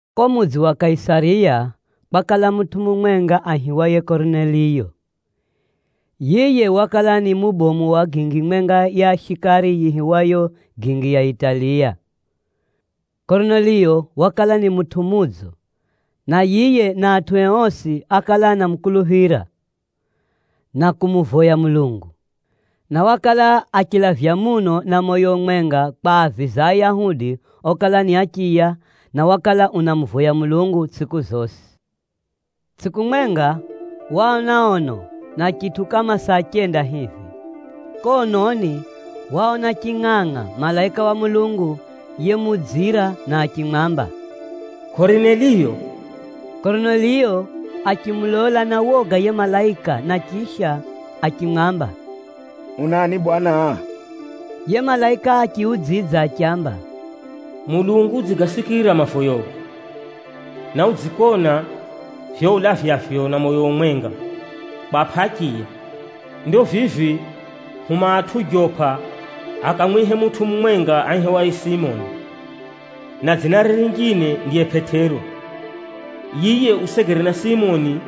Ko mudzi wa Kaisariya, kwakala mutʼu mumwenga aihiwaye Korineliyo. Yiye wakala ni mubomu wa gingi mwenga ya shikari yiihiwayo, “Gingi ya Italiya.” Korineliyo wakala ni mutʼu mudzo, na yiye na atʼue osi ákala anamukuluphira, na kumuvoya Mulungu. Na wakala achilavya muno na moyo umwenga kwaaviza Ayahudi okala ni achiya, na wakala unamuvoya Mulungu tsʼiku zosi. Tsʼiku mwenga, waona ono na chitʼu kama saa chenda hivi. Ko ononi, waona chingʼangʼa malaika wa Mulungu yemukudzira na achimwamba, “Korineliyo!” Korineliyo achimulola na woga yiye malaika na chisha, achimwamba, “Unani bwana?” Yiye malaika achiudzidza achiamba, “Mulungu udzigasikira mavoyogo, na udzikona vivyo ulavyavyo na moyo umwenga kwapʼa achiya. Ndo vivi huma atʼu Jopa akamwihe mutʼu mumwenga aihiwaye Simoni, na dzinare rinjine ndiye Pʼetero. Yiye usegere na Simoni,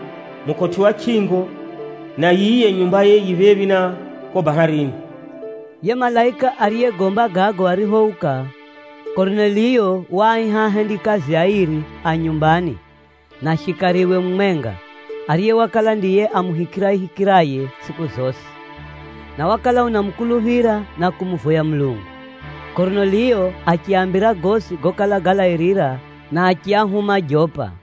mukotʼi wa chʼingo, na yiye nyumbaye yi phephi na ko baharini.” Yiye malaika ariyegomba gago ariphouka, Korineliyo waaiha ahendikazie airi a nyumbani, na shikariwe mumwenga, ariye wakala ndiye amuhikirayehikiraye tsʼiku zosi, na wakala unamukuluphira na kumuvoya Mulungu. Korineliyo achiaambira gosi gokala galairira, na achiahuma Jopa.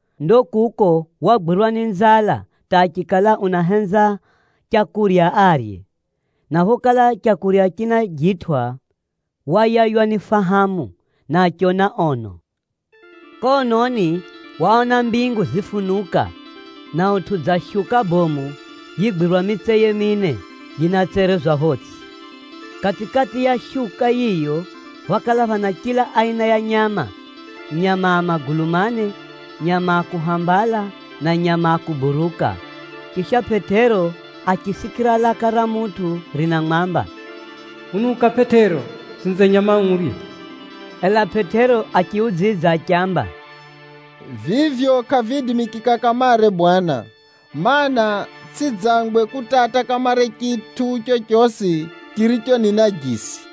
Ndo kuko wagwirwa ni nzala hata achikala unahenza leu arye, na phokala leu rinajitwʼa wayaywa ni fahamu, na achiona ono. Ko ononi, waona mbingu zifunuka, na utʼu dza shuka bomu yigwirwa mitseye mine, yinatserezwa photsʼi. Kati-kati ya shuka yiyo, phákala phana chila aina ya nyama, nyama a magulu mane, nyama a kuhambala na nyama a kuburuka. Chisha, Pʼetero achisikira laka ra mutʼu rinamwamba, “Unuka Pʼetero, utsinze nyama urye!” Ela Pʼetero achiudzidza achiamba, “Vivyo kʼaviidimikika kamare Bwana, mana, tsʼidzangwe kutata kamare chitʼu chochosi chiricho ni najisi.”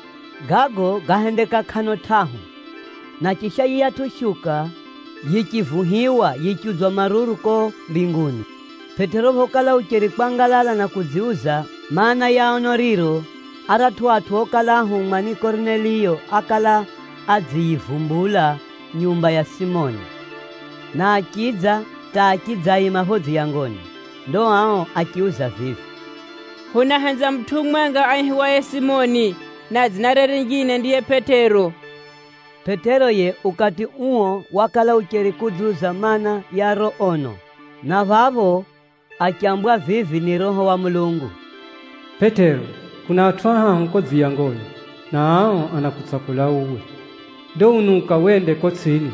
Gago gáhendeka kʼano tʼahu, na chisha yiyatʼu shuka yichivuhiwa, yichiudzwa maruru ko mbinguni. Pʼetero phokala ucheri kwangalala na kudziuza maana, ya ono riro, aratʼu atʼu okala ahumwa ni Korineliyo ákala adziyizumbula nyumba ya Simoni, na achidza hata achidzaima pho dziyangoni. Ndo ao achiuza vivi, “Hunahenza mutʼu mumwenga aihiwaye Simoni, na dzinare rinjine ndiye Pʼetero.” Pʼetero yiye ukati uo wakala ucheri kudziuza maana, ya riro ono, na phapho achambwa vivi ni Roho wa Mulungu, “Pʼetero, kuna atʼu ahahu ko dziyangoni, na ao anakutsakula uwe. Ndo unuka wende ko tsʼini,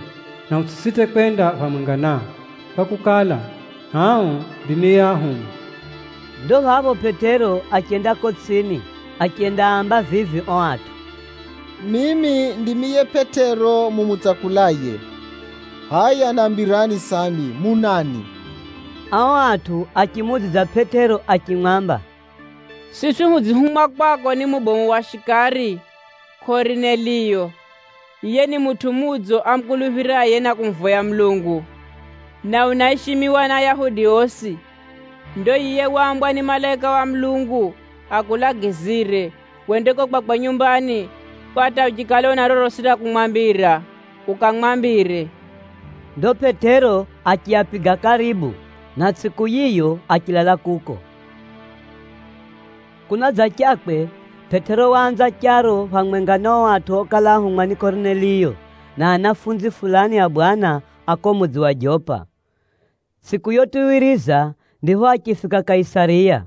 na utsʼisite kwenda phamwenga nao, kwakukala, ao ndimi yeahuma.” Ndo phapho Pʼetero achenda ko tsʼini, achendaamba vivi o atʼu, “Mimi ndimi yiye Pʼetero mumutsakulaye. Hʼaya nambirani sambi, munani?” Ao atʼu achimuudzidza Pʼetero achimwamba, “Siswi hudzihumwa kwako ni mubomu wa shikari, Korineliyo. Yiye ni mutʼu mudzo amukuluphiraye na kumuvoya Mulungu, na unaishimiwa ni Ayahudi osi. Ndo yiye waambwa ni malaika wa Mulungu akulagizire, wende ko kwakwe nyumbani, kwa hata uchikala una rorosi ra kumwambira, ukamwambire.” Ndo Pʼetero achiapiga karibu, na tsʼiku yiyo achilala kuko. Pʼetero unenda kwa Korineliyo Kunadzachakwe, Pʼetero waanza charo phamwenga na o atʼu okala áhumwa ni Korineliyo, na anafunzi fulani a Bwana a ko mudzi wa Jopa. Tsʼiku yotuwiriza, ndipho achifika Kaisariya.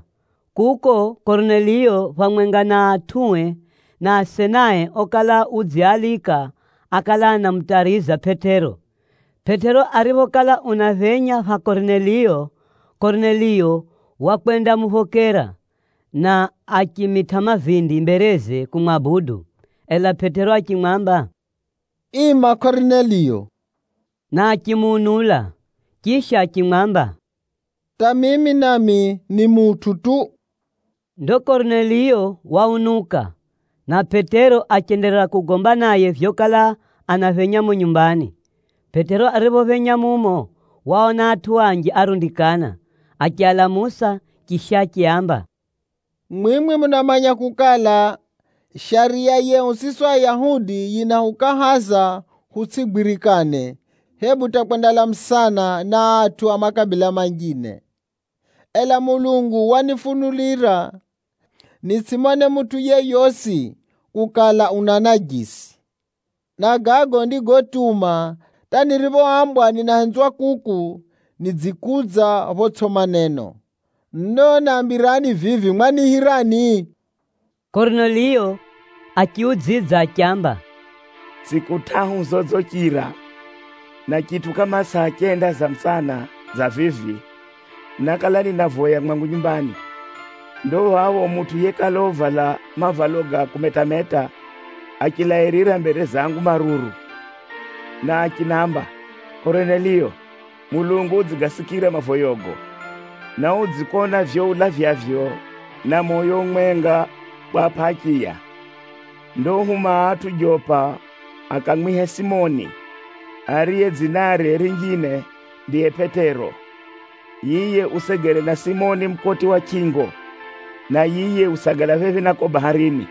Kuko, Korineliyo phamwenga na atʼue na asenae okala udziaalika, ákala anamutariza Pʼetero. Pʼetero ariphokala unaphenya pha Korineliyo, Korineliyo wakwendamuphokera, na achimitʼa mavindi mbereze kumwabudu. Ela Pʼetero achimwamba, “Ima Korineliyo,” na achimuunula. Chisha achimwamba, “Hata mimi nami ni mutʼu tu!” Ndo Korineliyo waunuka, na Pʼetero achenderera kugomba naye vyokala anaphenya mumo nyumbani. Pʼetero ariphophenya mumo, waona atʼu anji arundikana. Achialamusa chisha achiaamba, “Mwimwi munamanya kukala, shariya yehu siswi Ayahudi yinahukahaza hutsʼigwirikane, hebu hata kwendalamusana na atʼu a makabila manjine. Ela Mulungu wanifunulira nitsʼimone mutʼu yeyosi kukala, una najisi. Na gago ndigotuma hata niriphoambwa ninahenzwa kuku, nidzikudza photsʼi maneno. Ndo nambirani vivi, mwaniihirani?” Korineliyo achiudzidza achiamba, “Tsʼiku tʼahu zodzichira na chitʼu kama saa chenda za mutsana dza vivi, nákala ninavoya mwangu nyumbani. Ndo phapho, mutʼu yekala uvala mavalo ga kumetameta, achilairira mbere zangu maruru. Na achinamba, ‘Korineliyo! Mulungu udzigasikira mavoyogo, na udzikona vivyo ulavyavyo na moyo umwenga kwapʼa achiya. Ndo huma atʼu Jopa akamwihe Simoni, ariye dzinare rinjine ndiye Pʼetero. Yiye usegere na Simoni, mukotʼi wa chʼingo, na yiye usagala phephi na ko baharini.’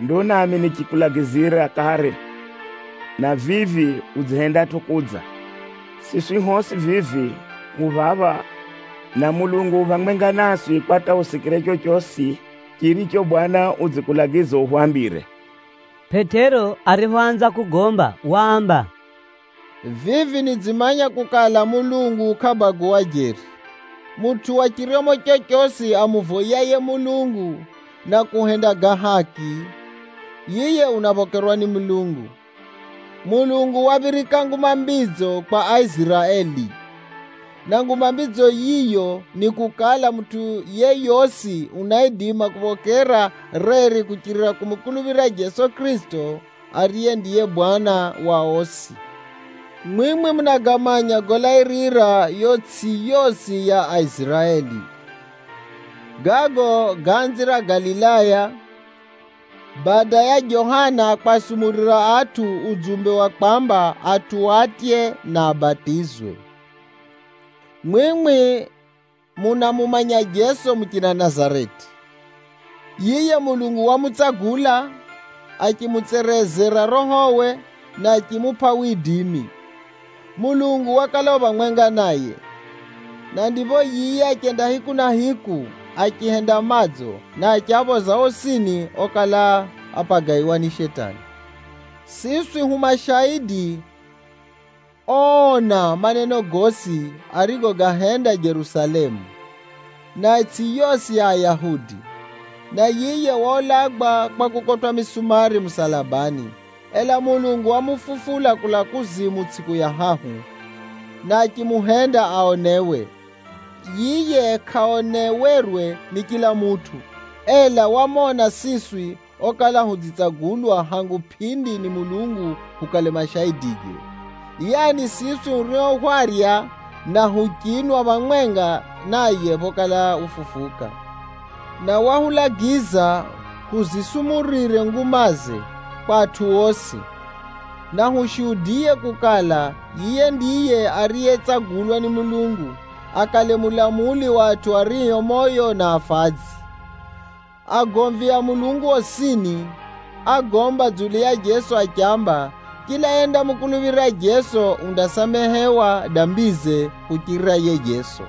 Ndo nami nichikulagizira kare, na vivi udzihendatʼo kudza. Siswi hosi vivi hu phapha, na Mulungu u phamwenga naswi kwa hata husikire chochosi chiricho Bwana udzikulagiza uhwambire.” Pʼetero ariphoanza kugomba, waamba, “Vivi nidzimanya kukala, Mulungu kʼabaguwa jeri. Mutʼu wa chiryomo chochosi amuvoyaye Mulungu na kuhenda ga haki, yiye unaphokerwa ni Mulungu. Mulungu waphirika Nguma Mbidzo kwa Aiziraeli. Na Nguma Mbidzo yiyo ni kukala, mutʼu yeyosi unaidima kuphokera reri kuchirira kumukuluphira Jeso Kʼirisito, ariye ndiye Bwana wa osi. Mwimwi munagamanya golairira yo itsʼi yosi ya Aiziraeli. Gago gáanzira Galilaya, bada ya Johana kwasumurira atʼu udzumbe wa kwaamba atʼu atye, na abatizwe. Mwimwi munamumanya Jeso muchina Nazareti. Yiye Mulungu wamutsagula, achimutserezera Rohowe, na achimupʼa widimi. Mulungu wakala u phamwenga naye, na ndipho yiye achenda hiku na hiku, achihenda madzo, na achiaphoza osini okala apagaiwa ni Shetani. Siswi hu mashaidi oona maneno gosi arigogahenda Jerusalemu, na itsʼi yosi ya Ayahudi. Na yiye waulagwa kwa kukotwʼa misumari musalabani. Ela Mulungu wamufufula kulaa kuzimu tsʼiku ya hahu, na achimuhenda aonewe. Yiye kʼaonewerwe ni chila mutʼu, ela hwamona siswi okala hudzitsagulwa hangu pʼindi ni Mulungu hukale mashaidige, yaani, siswi hurio hwarya, na huchinwa phamwenga naye phokala ufufuka. Na wahulagiza huzisumurire ngumaze kwa atʼu osi, na hushuhudiye kukala, yiye ndiye ariyetsagulwa ni Mulungu, akale mulamuli wa atʼu ario moyo na afadzi. Agomvi a Mulungu osini ágomba dzulu ya Jeso achiamba, chila yendamukuluphira Jeso, undasamehewa dambize kuchirira yiye Jeso.”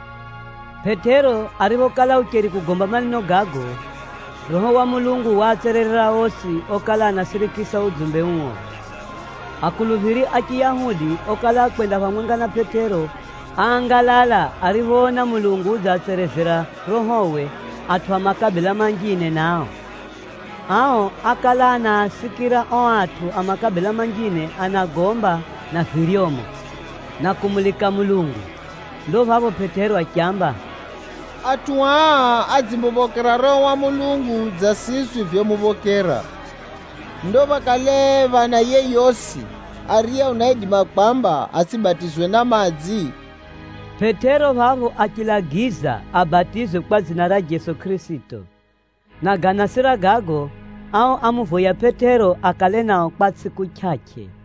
Pʼetero ariphokala ucheri kugomba maneno gago, Roho wa Mulungu waatsererera osi okala anasirikisa udzumbe uo. Akuluphiri a Chiyahudi okala akwenda phamwenga na Pʼetero, áangalala ariphoona Mulungu udziatserezera Rohowe atʼu a makabila manjine nao. Ao ákala anaasikira o atʼu a makabila manjine anagomba na viryomo, na kumulika Mulungu. Ndo phapho Pʼetero achiamba, “Atʼu aa adzimuphokera Roho wa Mulungu dza siswi vyomuphokera. Ndo phakale phana yeyosi, ariye unaidima kwamba atsʼibatizwe na madzi?” Pʼetero phapho achilagiza abatizwe kwa dzina ra Jeso Kʼirisito, na ganasira gago, ao ámuvoya Pʼetero akale nao kwa tsʼiku chʼachʼe.